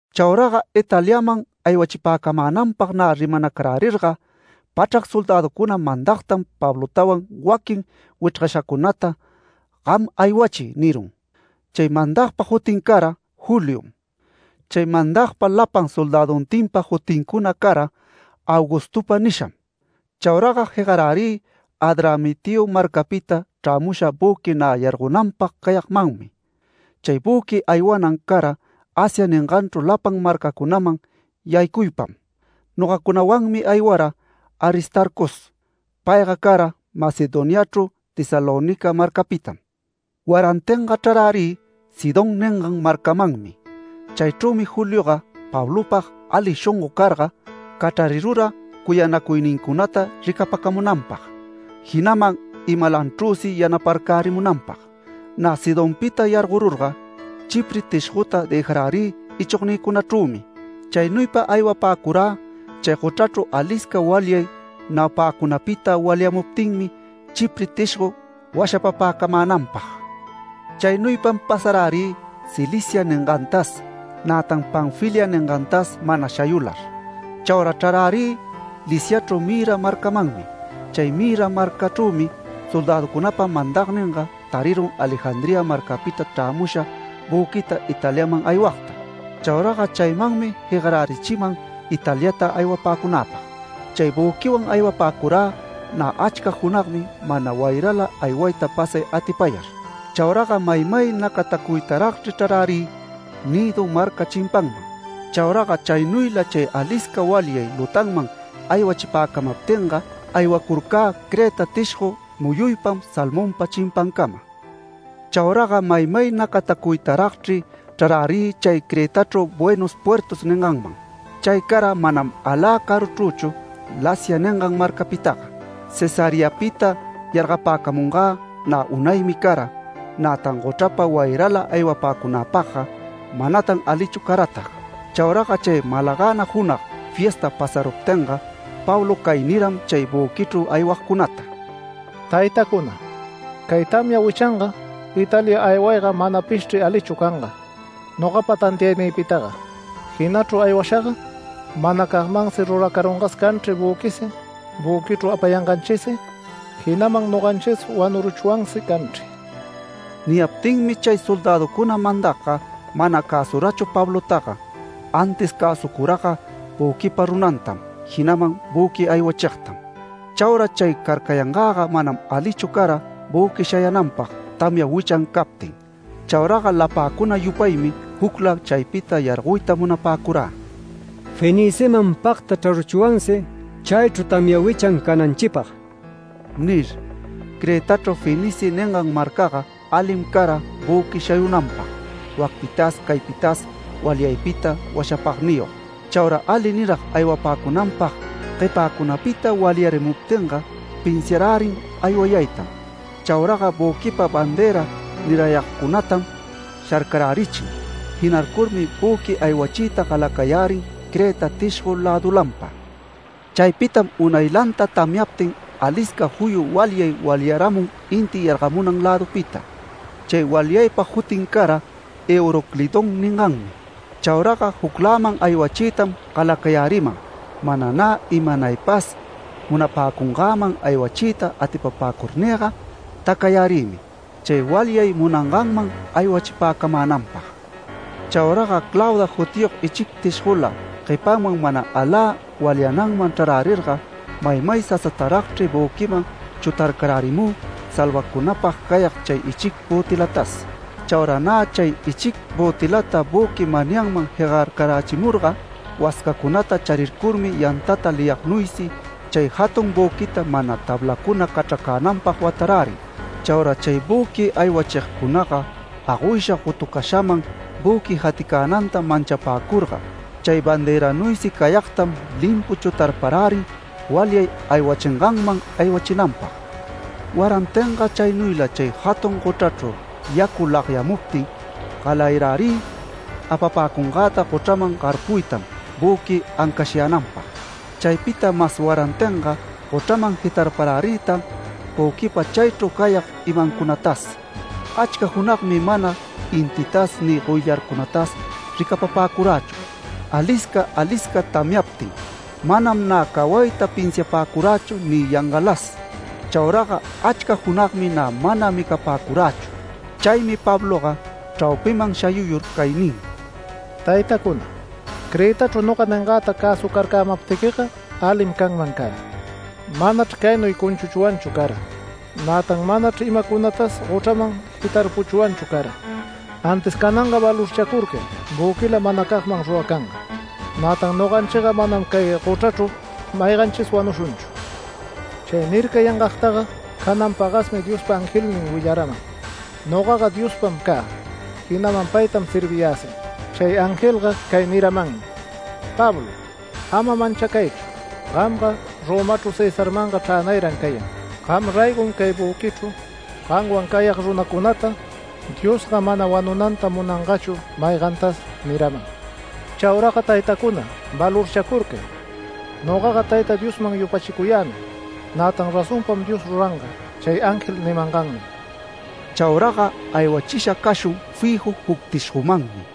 Chauraga Italiaman aywachipäcamänanpag nä rimanacarärirga, pachrac soldäducuna mandagtam Pablotawan waquin wichrgashacunata “Gam aywachiy” nirun. Chay mandagpa jutin cara Juliom. Chay mandagpa lapan soldäduntinpa jutincuna cara ‘Augustopa’ nisham. Chauraga jegarärï Adramitio marcapita chrämusha büqui nä yargonanpag cayagmanmi. Chay büqui aywanan cara Asia ninganchru lapan marcacunaman yaycuypam. Nogacunawanmi aywara Aristarcos. Payga cara Macedoniachru Tesalónica marcapitam. Warantinga chrarärï Sidón ningan marcamanmi. Chaychrümi Julioga Pablopag ali shongo carga, cachrarirura cuyanacuynincunata ricapacamunanpag, jinaman imalachrüsi yanaparcärimunanpag. Nä Sidonpita yargorurga, Chipre tishgota dëjarärï ichognïcunachrümi. Chaynuypa aywapäcurä chay gochrachru alisca walyay naupäcunapita walyamuptinmi Chipre tishgo washapapäcamänanpag. Chaynuypam pasarärï Cilicia ningantas, nätan Panfilia ningantas mana shayular. Chaura chrarärirä Liciachru Mira marcamanmi. Chay Mira marcachrümi soldäducunapa mandagninga tarirun Alejandría marcapita chrämusha büquita Italiaman aywagta. Chauraga chaymanmi jegarärichiman Italiata aywapäcunäpag. Chay büquiwan aywapäcurä nä achca junagmi mana wayrala aywayta pasay atipayar. Chauraga maymay nacatacuytaragchri chrarärï Gnido marca chimpanman. Chauraga chaynuyla chay alisca walyay lutanman aywachipäcamaptinga, aywacurcä Creta tishgo muyuypam Salmonpa chimpancama. Chauraga maymay nacatacuytaragchri chrarärï chay Cretachru Buenos Puertos ninganman. Chay cara manam alä caruchrüchu Lasea ningan marcapitaga. Cesareapita yargapäcamungä nä unaymi cara, nätan gochrapa wayrala aywapäcunäpagga manatan alichu caratag. Chauraga chay malagäna junag fiesta pasaruptinga, Pablo cay niram chay büquichru aywagcunata: “Taytacuna, cay tamya wichanga Italia aywayga manapishchri alichu canga nogapa tantiaynïpitaga. Jinachru aywashaga manacagmansi ruracarungas canchri büquisi. Büquichru apayanganchisi, jinaman noganchis wanuruchwansi canchri”. Niyaptinmi chay soldäducuna mandagga mana cäsurachu Pablotaga. Antis cäsucuraga büquipa runantam, jinaman büqui aywachigtam. Chaura chay carcayangäga manam alichu cara büqui shayänanpag tamya wichan captin. Chauraga lapäcuna yupaymi jucla chaypita yargoyta munapäcurä, “Feniceman pagta chraruchwansi, chaychru tamya wichan cananchipag” nir. Cretachru Fenice ningan marcaga, alim cara büqui shayunanpag wacpitas caypitas walyaypita washapagniyog. Chaura ali nirag aywapäcunanpag guepäcunapita walyarimuptinga pinsiarärin aywayaytam. Chauraga büquipa banderan nirayagcunatam sharcarärichin. Jinarcurmi büqui aywachiyta galacayärin Creta tishgo lädulanpa. Chaypitam unaylanta tamyantin alisca juyu walyay walyaramun inti yargamunan lädupita. Chay walyaypa jutin cara ‘Euroclidón’ ninganmi. Chauraga jucläman aywachiytam galacayäriman. Mana nä imanaypas munapäcungäman aywachiyta atipapäcurnïga tacayärïmi, chay walyay munanganman aywachipäcamänanpag. Chauraga Clauda jutiyog ichic tishgola guepanman mana alä walyananman chrarärirga maymay sasataragchri büquiman chutarcarärimü salvacunapag cayag chay ichic bötilatas. Chaura nä chay ichic bötilata büqui manyanman jegarcarachimurga, wascacunata charircurmi yantata liyagnuysi chay jatun büquita mana tablacuna cachracänanpag watarärin. Chaura chay büqui aywachigcunaga agoysha gotucashaman büqui jaticänanta manchapäcurga, chay banderanuysi cayagtam limpu chutarparärin walyay aywachinganman aywachinanpag. Warantinga chaynuyla chay jatun gochrachru yacu lagyamuptin galayarärï apapäcungäta gochraman garpuytam büqui ancashyänanpag. Chaypita mas warantinga gochraman jitarparärïtan büquipa chaychru cayag imancunatas. Achca junagmi mana intitas ni goyllarcunatas ricapapäcurächu alisca alisca tamyaptin. ¡Manam nä cawayta pinsiapäcurächu ni yangalas! Chauraga achca junagmi nä mana micapäcurächu. Chaymi Pabloga chraupiman shayuyur cay nin: “Taytacuna, Cretachru noga ningäta cäsucarcämaptiquiga alim canman cara. Manachr caynuy cunchuchwanchu cara. Nätan manachr imacunatas gochraman jitarpuchwanchu cara. Antis cananga valorchacurcay büquilam manacagman ruracanga. Nätan noganchiga manam cay gochrachru mayganchis wanushunchu. Chay nircayangagtaga canan pagasmi Diospa angelnin willaraman. Nogaga Diospam cä, jinaman paytam serviyäsi. Chay angelga cay niramanmi: ‘Pablo, ama manchacaychu. Gamga Romachru Cesarmanga chränayran cayan. Gam raygom cay büquichru gamwan cayag runacunata, Diosga manam wanunanta munangachu maygantas’ niraman. Chauraga taytacuna, valorchacurcay. Nogaga Tayta Diosman yupachicuyämi. Nätan razonpam Dios ruranga, chay ángel nimangannuy”. Chauraga aywachisha cashun fiju juc tishgomanmi.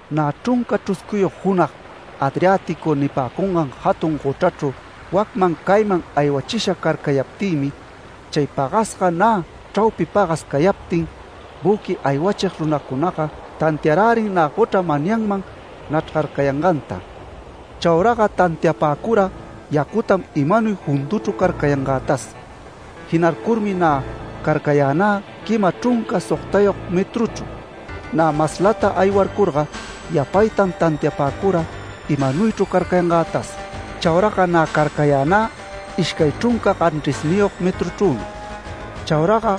Nä chrunca chruscuyog junag Adriático nipäcungan jatun gochrachru wacman cayman aywachisha carcayaptïmi, chay pagasga nä chraupi pagas cayaptin, büqui aywachig runacunaga tantiarärin nä gochra manyanman nachrgarcayanganta. Chauraga tantiapäcura yacutam imanuy junduchru carcayangätas. Jinarcurmi nä carcayänä quima chrunca sogtayog metruchru. Nä maslata aywarcurga yapaytan tantiapäcura imanuychru carcayangätas. Chauraga nä carcayä nä ishcay chrunca ganchrisniyog metruchrümi. Chauraga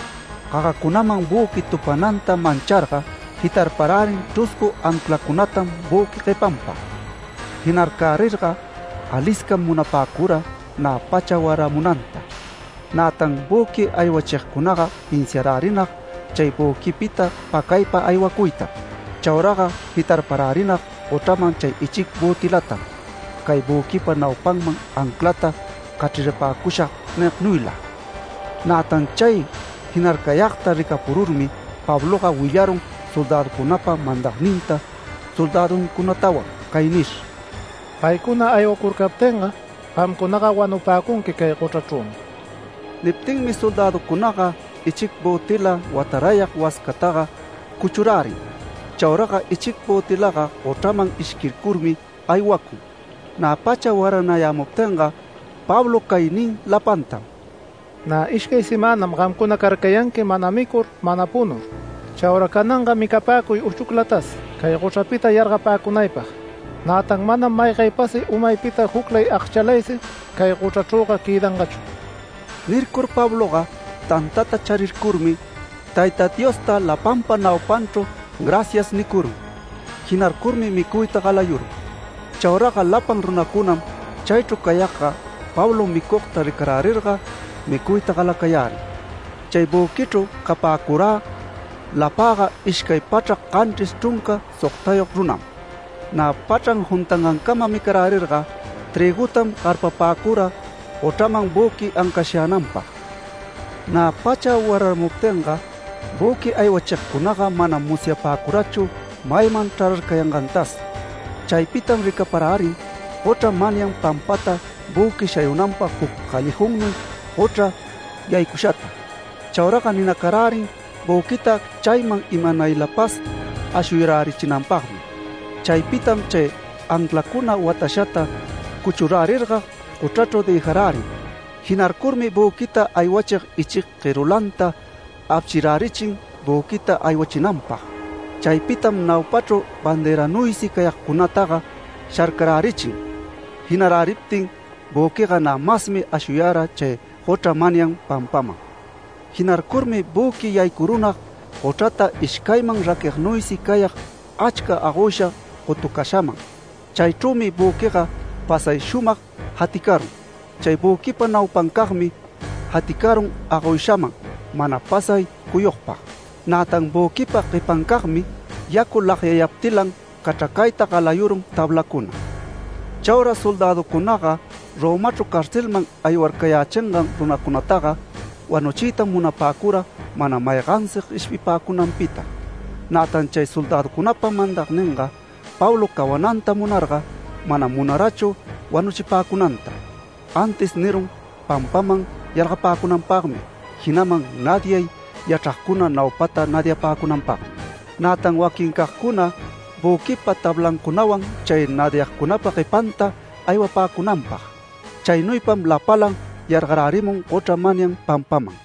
gagacunaman büqui tupananta mancharga, jitarparärin chruscu anclacunatam büqui guepanpa. Jinacarcärirga, aliscam munapäcura nä pacha waramunanta. Nätan büqui aywachigcunaga pinsiarärinag chay büquipita pacaypa aywacuytam. Chauraga jitarparärinag gochraman chay ichic bötilatam “Cay büquipa naupanman anclata cachrarpapäcushag” nignuyla. Nätan chay jinarcayagta ricapururmi Pabloga willarun soldäducunapa mandagninta soldäduncunatawan cay nir: “Paycuna aywacurcaptinga gamcunaga wanupäcunqui cay gochrachrümi.” Niptinmi soldäducunaga ichic bötila watarayag wascataga cuchurärin. Chauraga ichig bötilaga gochraman ishquircurmi aywacun. Nä pacha waranayämuptinga Pablo cay nin lapantam: “Nä ishcay semänam gamcuna carcayanqui mana micur, mana punur. Chaura cananga micapäcuy uchuclatas cay gochrapita yargapäcunaypag. Nätan manam maygaypasi umaypita juclay agchalaysi cay gochrachrüga quëdangachu”. Nircur Pabloga tantata charircurmi, Tayta Diosta lapanpa naupanchru “Gracias” nicurun. Jinarcurmi micuyta galayurun. Chauraga lapan runacunam chaychru cayagga Pablo micugta ricarärirga, micuyta galacayärin. Chay büquichru capäcurä lapäga ishcay pachrac, ganchris chrunca sogtayog runam. Nä pachran juntangancama micarärirga, trïgutam garpapäcura gochraman büqui ancashyänanpag. Nä pacha wararamuptinga, büqui aywachigcunaga manam musyapäcurachu mayman chrararcayangantas. Chaypitam ricaparärin gochra manyan pampata büqui shayunanpag juc callejonnuy gochra yaycushata. Chauraga ninacarärin büquita chayman imanaylapas ashuyärichinanpagmi. Chaypitam chay anclacuna watashata cuchurärirga gochrachru dëjarärin. Jinarcurmi büquita aywachig ichic guerulanta apshirärichin büquita aywachinanpag. Chaypitam naupachru banderanuysi cayagcunataga sharcarärichin. Jinaräriptin büquiga nä masmi ashuyara chay gochra manyan pampaman. Jinarcurmi büqui yaycurunag gochrata ishcayman raquignuysi cayag, achca agoysha gotucashaman. Chaychrümi büquiga pasay shumag jaticarun. Chay büquipa naupancagmi jaticarun agoyshaman mana pasay cuyugpag. Nätan büquipa guepancagmi, yacu lagyayaptilan cachracayta galayurun tablacuna. Chaura soldäducunaga Romachru carcelman aywarcayächingan runacunataga wanuchiytam munapäcura mana maygansi gueshpipäcunanpita. Nätan chay soldäducunapa mandagninga Pablo cawananta munarga, manam munarachu wanuchipäcunanta, antis nirun pampaman yargapäcunanpagmi, jinaman nadiay yachragcuna naupata nadiapäcunanpagmi, nätan waquincagcuna büquipa tablancunawan chay nadiagcunapa guepanta aywapäcunanpag. Chaynuypam lapalan yargarärimun gochra manyan pampaman.